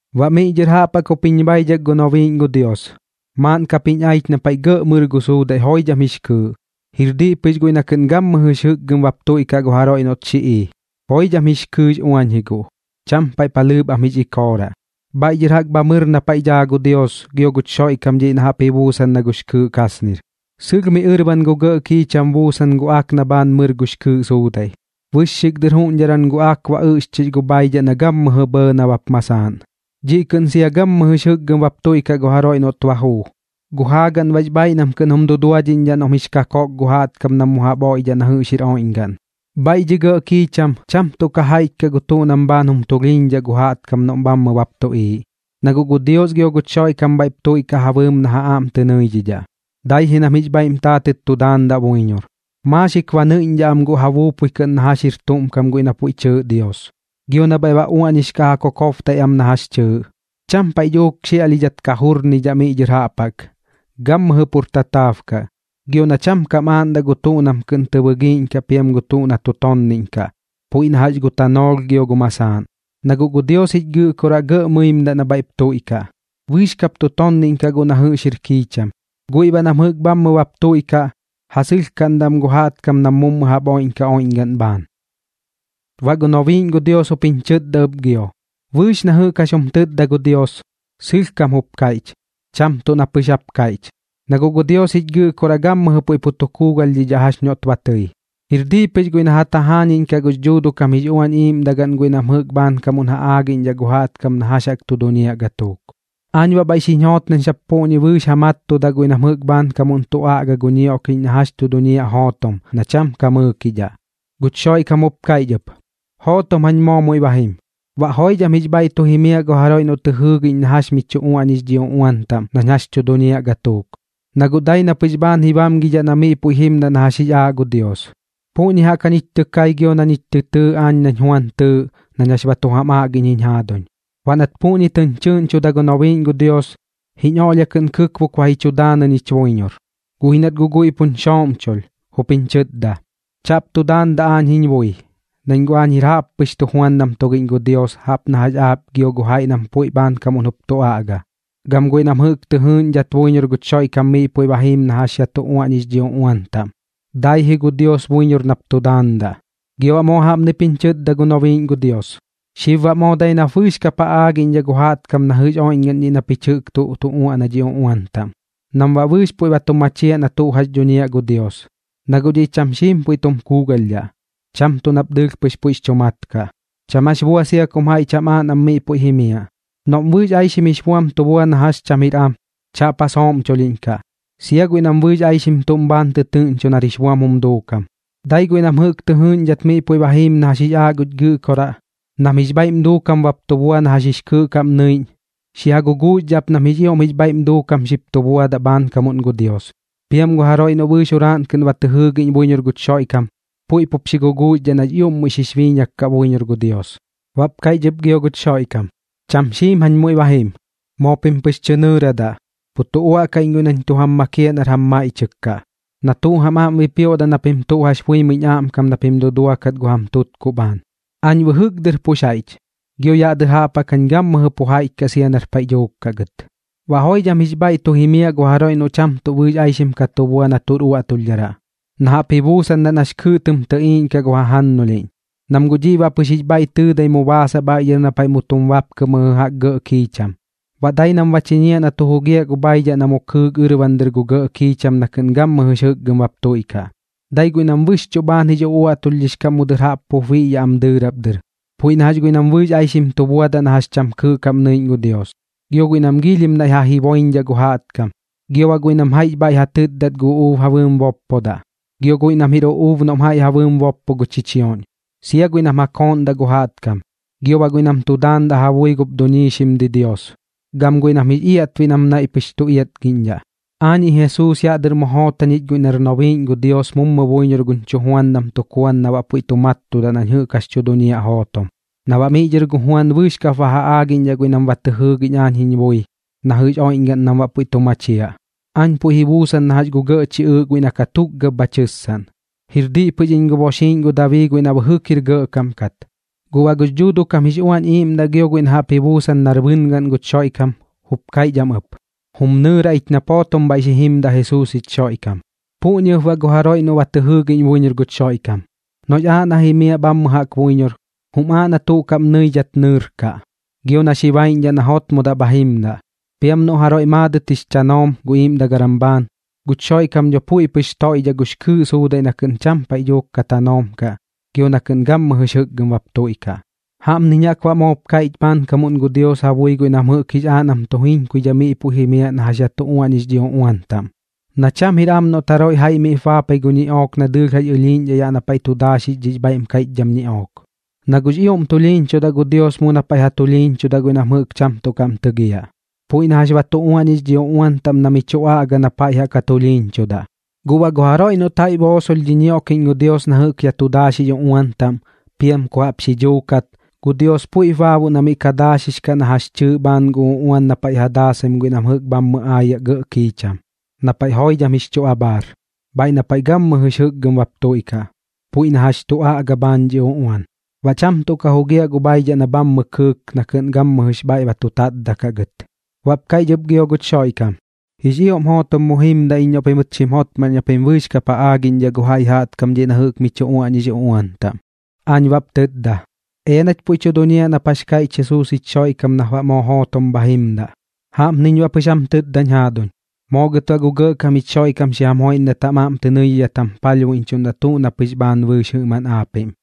Baꞌ miꞌ dhɨr jaꞌp jaꞌk jup jiñ baidhak gu nobiiꞌñ gu Dios, maaꞌn kap jiñ aich na paiꞌ gɇꞌ mɨr gu suudaiꞌ joidham jix kɨɨꞌ, jir diꞌ pɨx guiꞌ na kɨꞌn gammɨjɨx jɨkgɨm bap tuiꞌkaꞌ gu jaroiꞌ noꞌt xi ii. Joidham jix kɨɨꞌx uañ ji guꞌ, cham paiꞌ palhɨɨp pɨx am jix ikooraꞌ, bhaiꞌ dhɨr jaꞌk bha mɨr na paiꞌ daa gu Dios gio guch Xoiꞌkam dhiꞌ na jaꞌp ji buusan na jax gux kɨɨꞌ kasnir. Sɨlh miꞌ ɨrban gu gɇꞌ kiicham buusan gu ak na bhaan mɨr gux kɨɨꞌ suudaiꞌ, bɨxxik dɨr juuꞌñdharam gu ak ba ɨꞌxchix gu bhaidhaꞌ na gammɨjɨ bhɇɇ nabap masaaꞌn. Dhiꞌ kɨꞌn sia gammɨjɨx jɨkgɨm bap tuiꞌkaꞌ gu jaroiꞌ noꞌt ba juu, gu jaagaꞌn baꞌx bhaaiꞌ nam kɨꞌn jum duduadhiꞌñdhaꞌ noꞌm jix kakoꞌk gu jaꞌtkam nam mu jaꞌp oiꞌdhaꞌ na jɨꞌx jir oiꞌñgaꞌn. Bhaiꞌ dhi gɇꞌ kiicham cham tuꞌ ka jaiꞌch kaꞌ gu tuꞌ nam bhaan jum tulhiiñaꞌ gu jaꞌtkam noꞌm bhammɨ bap tuꞌiiꞌ, na guꞌ gu Dios gio guch Xoiꞌkam bhaiꞌp tuiꞌkaꞌ ja bɨɨm na ja aꞌm tɨ nɨiꞌñdhaꞌ, dai ji nam jix bhaiꞌm taatɨt tu daandaꞌ buiñor. Maaxik ba nɨiꞌñdhaꞌ am guꞌ ja buupui kɨꞌn na jax jir tuꞌm kam guiꞌ na puiꞌ tɨɨꞌ Dios, gio na bhaiꞌ ba uaꞌñix kaꞌ ja kokobtaiꞌ am na jax chɨɨꞌ. Cham paiꞌ dhuuk xiaꞌlhidhat ka jurnidhaꞌ miꞌ dhɨr jaꞌp jaꞌk, gammɨjɨ pur tataab kaꞌ. Gio na cham kam aaꞌndaꞌ gu tuꞌ nam kɨꞌn tɨ bɨgiiꞌñkaꞌ piam gu tuꞌ na tu tonniꞌñkaꞌ, puiꞌ na jax gu tanoolh gio gu masaaꞌn, na guꞌ gu Dios jich Gɨꞌkoraꞌ gɇꞌ mɨimdaꞌ na bhaiꞌp tuiꞌkaꞌ. Bɨɨx kap tu tonniꞌñkaꞌ guꞌ na jɨꞌx jir kiicham, guiꞌ baꞌ nam jɨꞌk bhammɨ bap tuiꞌkaꞌ, ja sɨlhkaꞌndaꞌ am gu jaꞌtkam na mummu jaꞌp tu oiꞌñkaꞌ oiꞌñgaꞌn bhaan. Baꞌ gu nobiiꞌñ gu Dios jup jiñ chɨtda ɨp gio: ―Bɨɨx na jɨꞌk jax jum tɨtda gu Dios, sɨlhkam jup kaiꞌch, cham tuꞌ na pɨx jap kaiꞌch, na guꞌ gu Dios jich Gɨꞌkoraꞌ gammɨjɨ puiꞌ tu kuugalhdhidhaꞌ jax noꞌt ba tɨi. Jir diꞌ pɨx guiꞌ na ja tajaañiꞌñkaꞌ gux Dhuuduꞌ kam jix Uañ Iiꞌmdagaꞌn guiꞌ nam jɨꞌk bhaankamuꞌn ja aagiꞌñdhaꞌ gu jaꞌtkam na jax tu duñiaꞌ gatuuk. Aañ baꞌ bhaiꞌp xiñ joot nañ sap puꞌñi bɨɨx ja mattudaꞌ guiꞌ nam jɨꞌk bhaankamuꞌn tu aꞌga gu ñioꞌkiꞌñ na jax tu duñiaꞌ jootom, na cham ka mɨɨkidhaꞌ. Guch Xoiꞌkam jup kaiꞌch ɨp: ―Jootom jañ moo muiꞌ ba jim. Baꞌ joidham jix bhaiꞌ tu jimiaꞌ gu jaroiꞌ noꞌ tɨ jɨɨgiꞌñ na jax mi chu uaꞌñix dhi uꞌuan taꞌm nañ jax chu duñiaꞌ gatuuk, na guꞌ dai na pɨx bhaan ji bamgidhaꞌ na miꞌ puiꞌ ba jimdaꞌ na jax jix aaꞌ gu Dios. Puꞌñi jaꞌk jañich tɨ kai gio na ñich tɨ tɨɨ aañ nañ Juan tɨɨꞌ nañ jax ba tu jam aꞌgiꞌñ jiñ jaaduñ. Baꞌ nat puꞌñi tɨñ chɨꞌñchuda gu nobiiꞌñ gu Dios, jiñ oꞌlhia kɨꞌn kɨkbok ba ji chu daanɨ ñich buiñor, guꞌ ji nat guꞌ guiꞌ puñ xooꞌmchulh, jup jiñ chɨtda: ―Chaꞌp tu daandaꞌ aañ jiñ bui, nañ guꞌ aañ jir jaꞌppɨx tujuandam tugiꞌñ gu Dios jaꞌp na jax aap gio gu jaiꞌ nam puiꞌ bhaankamuꞌn jup tu aꞌga, gam guiꞌ nam jɨꞌk tɨ jɨɨꞌñdhat buiñor guch Xoiꞌkam miꞌ puiꞌ ba jiim na jax yaꞌ tu uaꞌñix dhi uꞌuan taꞌm. Dai ji gu Dios buiñor nap tu daandaꞌ. Gio baꞌ moo jaꞌpnip jiñ chɨtda gu nobiiꞌñ gu Dios: ―Xib baꞌ moo dai nap bɨɨx kap ja aagiꞌñdhaꞌ gu jaꞌtkam na jɨꞌx oiꞌñgaꞌn dhiꞌ na pich jɨꞌk tuꞌ tu uaꞌna dhi uꞌuan taꞌm, nam baꞌ bɨɨx puiꞌ ba tu machiaꞌ na tuꞌ jax dhuñiaꞌ gu Dios, na guꞌ dhiꞌ cham xiim puiꞌ tu kuugalhdhaꞌ. Cham tuꞌ nap dɨɨlh pɨx puiꞌx chu mat kaꞌ. Cham jax bua sia kum jaiꞌ cham aaꞌ nam miꞌ puiꞌ jimiaꞌ. Noꞌm bɨɨx aixim jix buam tu bua na jax cham jir am, chaꞌp ja sooꞌmchulhiꞌñkaꞌ, sia guiꞌ nam bɨɨx aixim tuꞌm bhaan tɨtɨɨꞌñcho nar jix buam jum duukam. Dai guiꞌ nam jɨꞌk tɨ jɨɨꞌñdhat miꞌ puiꞌ ba jiim na jax jix aaꞌ guch Gɨꞌkoraꞌ, nam jix bhaiꞌm duukam bap tu bua na jax jix kɨɨꞌ kaꞌm nɨiꞌñ, xi ja guguuxdhaꞌ ap nam jix ioꞌm jix bhaiꞌm duukam xip tu buadaꞌ bhaankamuꞌn gu Dios. Piam gu jaroiꞌ noꞌ bɨɨx juraaꞌn kɨꞌn ba tɨ jɨɨgiꞌñ buiñor guch Xoiꞌkam, puiꞌp jup xi guguuxdhaꞌ nax ioꞌm muiꞌ xix biiñak kaꞌ buiñor gu Dios. Baꞌp kaiꞌch ɨp gio guch Xoiꞌkam: ―Cham xiim jañ muiꞌ ba jim. Moo pim pɨx tɨ nɨɨradaꞌ. Pu tu uaꞌdaꞌ iñ guiꞌ nañ tu jam makiaꞌ nar jam maiꞌchɨk kaꞌ, na tuꞌ jam aꞌm bipioꞌdaꞌ na pim tuꞌ jax buimɨiñ aꞌmkam na pim duduakat gu jam tutkuꞌ bhaan. Aañ bɨjɨk dɨr pux jaiꞌch, gio yaꞌ dɨr jaꞌp jaꞌk gammɨjɨ pu jaiꞌch kaꞌ iñ sia nar paiꞌ dhuuk kaꞌ gɨt. Baꞌ joidham jix bhaiꞌ tu jimiaꞌ gu jaroiꞌ noꞌ cham tuꞌ bɨɨx aixim ka tu bua na tuꞌr uaꞌtulhdharaꞌ, na jaꞌp ji buusandaꞌ nax kɨɨꞌ tɨm tɨꞌiiꞌñkaꞌ gu jajannulhiꞌñ, nam guꞌ dhiꞌ baꞌ pɨx jix bhaiꞌ tɨɨdai mu baasaꞌ bhaiꞌ dhɨr na paiꞌ mu tum bapkɨ mɨjɨ jaꞌk gɇꞌ kiicham, baꞌ dai nam ba chiñiaꞌ na tu jugiaꞌ gu bhaidhaꞌ na mu kɨɨk ɨrban gu gɇꞌ kiicham na kɨꞌn gammɨjɨx jɨkgɨm bap tuiꞌkaꞌ. Dai guiꞌ nam bɨxchuꞌ bhaan jix uꞌuaꞌtulhdhix kaꞌm mu dɨr jaꞌp pup biꞌyaꞌ dɨɨrap dɨr, puiꞌ na jax guiꞌ nam bɨɨx aixim tu buadaꞌ na jax cham kɨɨꞌ kaꞌm nɨiꞌñ gu Dios, gio guiꞌ nam giilhim naiꞌ ja jiboiñdhaꞌ gu jaꞌtkam, gio baꞌ guiꞌ nam jaiꞌx bhaiꞌ ja tɨtdat gu uꞌuub ja bɨɨm boppodaꞌ, gio guiꞌ nam jir uꞌuub noꞌm jaiꞌ ja bɨɨm boppo gu chichioꞌñ, sia guiꞌ nam ja kooꞌndaꞌ gu jaꞌtkam, gio baꞌ guiꞌ nam tu daandaꞌ ja bui gup duiñxim didios, gam guiꞌ nam jix iaꞌtbiꞌ nam naiꞌ pɨx tu iatgiꞌñdhaꞌ. ’Aañiꞌ Jesuus yaꞌ dɨr mu joot jañich guiꞌ nar nobiiꞌñ gu Dios mummu buiñor guñ chujuandam tuk Juan na baꞌ puiꞌ tu mattudaꞌ nañ jɨꞌk jax tu duñiaꞌ jootom, na baꞌ miꞌ dhɨr gu Juan bɨɨx kap ba ja aagiꞌñdhaꞌ guiꞌ nam ba tɨ jɨɨgiꞌñ aañ jiñ bui na jɨꞌx oiꞌñgaꞌn nam baꞌ puiꞌ tu machiaꞌ. Aañ puiꞌ ji buusan na jax gu gɇꞌ chiꞌɨɨꞌ guiꞌ na katukgab bha tɨssaꞌn. Jir diꞌ pɨx iñ gu boxiiꞌñ gu Dabii guiꞌ na bɨjɨk jir gɇꞌkam kat. Guꞌ baꞌ gux Dhuuduꞌ kam jix Uañ Iiꞌmdaꞌ gio guiꞌ na jaꞌp ji buusan nar bɨngaꞌn guch Xoiꞌkam, jup kaiꞌch am ɨp: ―Jum nɨɨra ich nap jootom bhaiꞌ xi jimdaꞌ Jesuus jich Xoiꞌkam. Puꞌñi ɨp baꞌ gu jaroiꞌ noꞌ ba tɨ jɨɨgiꞌñ buiñor guch Xoiꞌkam, noꞌx aaꞌ na jimiaꞌ bhammɨ jaꞌk buiñor, jum aaꞌ na tuꞌ kaꞌm nɨidhat nɨɨrkaꞌ, gio na xi baiꞌñdhaꞌ na jotmodaꞌ bha jimdaꞌ. Piam noꞌ jaroiꞌ maadɨt jix chanoom gu iiꞌmdagaram bhaan, guch Xoiꞌkam dho puiꞌ pɨx toiꞌdhaꞌ gux kɨɨꞌ suudaiꞌ na kɨꞌn cham paiꞌ dhuuk ka tanoom kaꞌ gio na kɨꞌn gammɨjɨx jɨkgɨm bap tuiꞌkaꞌ. Jaꞌpniñ jaꞌk baꞌ moop kaiꞌch bhaankamuꞌn gu Dios ja bui guiꞌ nam jɨꞌk jix aaꞌ nam tu jiñkuidhai miꞌ puiꞌ jimiaꞌ na jax yaꞌ tu uaꞌñix dhi uꞌuan taꞌm: Na cham jir am noꞌt jaroiꞌ jaiꞌ miꞌp baapai gu ñiꞌook na dɨɨlh jax ɨlhiiꞌñ yaꞌ na paiꞌ tu daaxix dhix bhaiꞌm kaiꞌchdham ñiꞌook, na guꞌx ioꞌm tulhiiñchudaꞌ gu Dios mu na paiꞌ ja tulhiiñchudaꞌ guiꞌ nam jɨꞌk cham tuꞌ kaꞌm tɨgiaꞌ, puiꞌ na jax ba tu uaꞌñix dhi uꞌuan taꞌm na mi chu aꞌga na paiꞌ jaꞌk ja tulhiiñchudaꞌ. Guꞌ baꞌ gu jaroiꞌ noꞌt jaiꞌ boosolh dhi ñioꞌkiꞌñ gu Dios na jɨꞌk yaꞌ tu daaxix uꞌuan taꞌm, piam ku jaꞌp xi dhuukat, gu Dios puiꞌp baaboꞌ na miꞌ ka daaxix kaꞌ na jax chɨɨꞌ bhaan gu uꞌuan na paiꞌ ja daasaim guiꞌ nam jɨꞌk bhammɨ aayaꞌ gɇꞌ kiicham, na paiꞌ joidham jix chu abhaar, bhaiꞌ na paiꞌ gammɨjɨx jɨkgɨm bap tuiꞌkaꞌ, puiꞌ na jax tu aꞌga bhaan dhi uꞌuan. Baꞌ cham tuꞌ ka jugiaꞌ gu bhaidhaꞌ na bhammɨ kɨɨk na kɨꞌn gammɨjɨx bhaiꞌ ba tu tatdaꞌ kaꞌ gɨt. Baꞌp kaiꞌch ɨp gio guch Xoiꞌkam: ―Jix ioꞌm jootom mu jimdaꞌ iñ noꞌ pimɨt xim jotmaꞌn na pim bɨɨx kap ja aagiꞌñdhaꞌ gu jaiꞌ jaꞌtkam dhiꞌ na jɨꞌk mi chu uaꞌñix uꞌuan taꞌm. Aañ baꞌp tɨtda: ―Ea nach puiꞌ tu duñiaꞌ nap jax kaiꞌch Jesuus jich Xoiꞌkam nap baꞌ moo jootom bha jimdaꞌ. Jaꞌpniñ baꞌ pɨx jam tɨtdañ jaaduñ. Moo gɨt baꞌ gu Gɇꞌkam jich Xoiꞌkam xi jam joiꞌndat jam aꞌm tɨ nɨidhidhat jam palhbuiꞌñchuꞌ tuꞌ na pɨx bhaan bɨɨx jɨꞌmaꞌn aapiꞌm.